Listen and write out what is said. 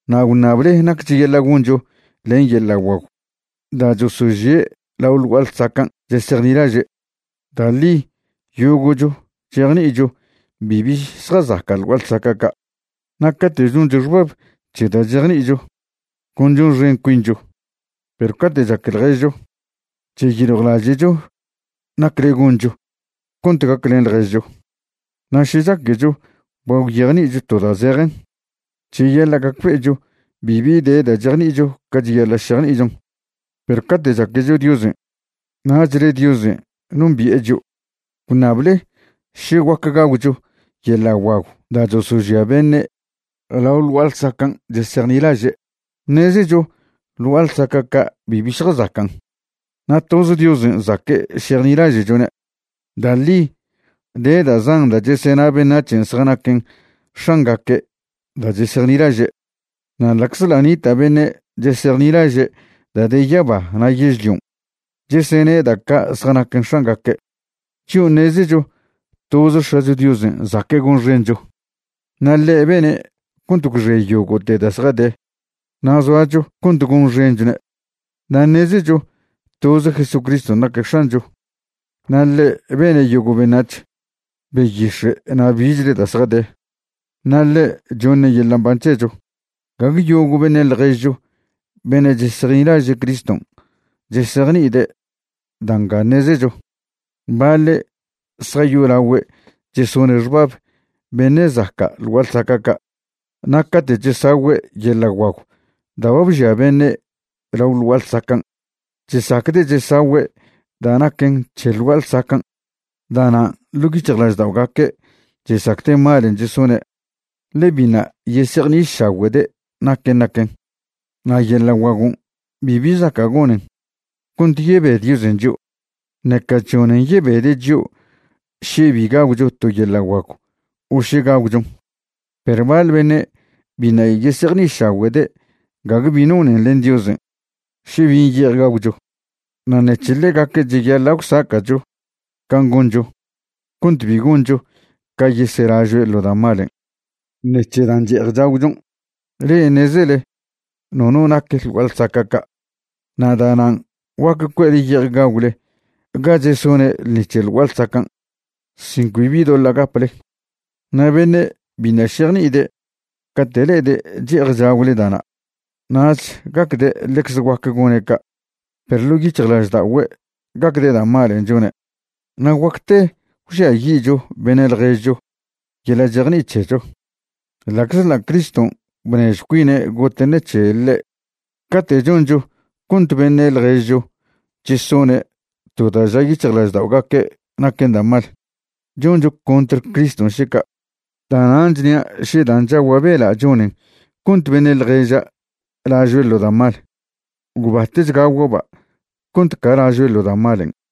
Na' gwṉable nac cheyaḻa' goncho len yeḻa' guagw da' chosožie' lao ḻ gua'a ḻsacan' chesejnilaže'. Da' ḻi yogo'cho chejni'icho bibi zjazaca' ḻ gua'a lsaca' ca'. Na' cate' choncho xbab c̱he da' chejni'icho, con chonxen cuincho, perw cate' chaque ḻježcho, cheyiljwlaže'cho nacle goncho cont gaclen ḻježcho. Na' še chaquecho ba gwyejni'icho to da' zejen, cheyaḻa' gacbe'echo bibi de da' chejni'icho ca cheyaḻa' šejni'ichon. Perw cate' chaquecho Diosen', nachle Diosen' nombi'e chio'. Gwṉable še guac gagwcho yeḻa' guagw da' chosožia beṉe' lao ḻ gua'a ḻsacan' chesejnilaže'. Ṉezecho ḻ gua'a ḻsaca' ca' bibi zjazacan', na' toz Diosen' zaque' šejnilaže'chone'. Da' ḻi de da' zan da' chesena beṉac̱hen zjanaquen x̱angaque' da' chesejnilaže'. Na' ḻa'czḻa' nita' beṉe' chesejnilaže' da' de yaba na' yežlion' chesene' da' ca' zjanaquen x̱angaque', chio' ṉezecho toze X̱acho Diosen' zaque' gonxencho, na' ḻe' bene' cont gwxe yogo'te da' zjade na' zoacho cont gonxenchone'. Na' ṉezecho toze Jesucriston' naque' X̱ancho, na' ḻe' bene' yogo' beṉac̱h, beyix̱e' na' bichle da' zjade, na' ḻe' choṉe' yeḻa' mban c̱hecho. Gague yogo' beṉe' ḻježcho beṉe' chesejnilaže' Criston' chesejni'ide' da' nga ṉezecho. Baḻe' zjayolagüe' chesone' xbab beṉe' zaca' ḻ gua'a ḻsaca' ca', na' cate' chesagüe' yeḻa' guagw da' ba bžia beṉe' lao ḻ gua'a ḻsacan', chesacde' chesagüe' da' naquen c̱he ḻ gua'a ḻsacan'. Da'nan' ḻo' yic̱hjlažda'ogaque' chesacde' malen' chesone', ḻe biṉa' yesejni'išagüe'de' naquen' naquen. Na' yeḻa' guagon' bibi zaca' gonen cont yebe Diosen' chio', ṉeca chžonen yebede' chio' še bi gagwcho to yeḻa' guagw o še gagwchon'. Perw baḻ beṉe' biṉa' yesejni'išagüe'de' gague bi nonen len Diosen' še bin' ye'ej gagwcho. Na' ṉec̱he ḻegaque' cheyaḻa' gwsaca'cho can' goncho cont bi goncho ca yeselažoe' ḻo da' malen' ṉec̱he dan' che'ej chagwchon'. Le'e ṉezele nono nac ḻ gua'a ḻsaca' ca', na' da'nan' guac cue'le ye'ej gagwle ga chesone' ḻṉi c̱he ḻ gua'a ḻsacan' sin cbi bi doḻa' gaple. Na' beṉe' biṉa' šejni'ide' cate' le'ede' che'ej chagwle da'na', nach gacde' ḻecze guac gone' ca', perw ḻo' yic̱hjlažda'ogüe' gacde' da' malen' chone'. Na' guacte gwžiayi'cho beṉe' ḻježcho yeḻa' chejni'i c̱hecho, ḻa'czḻa' Criston' bnežjw cuine' gote' ṉec̱he ḻe'. Cate' choncho cont beṉe' ḻježcho chesone' to da' ža yic̱hjlažda'ogaque' naquen da' mal, choncho contr Criston' še ca'. Da'nan' chnia' še dan' chagua' bela' chonen cont beṉe' ḻježa' lažoe' ḻo da' mal, gwbatech gagua'ba' cont ca lažoe' ḻo da' malen'.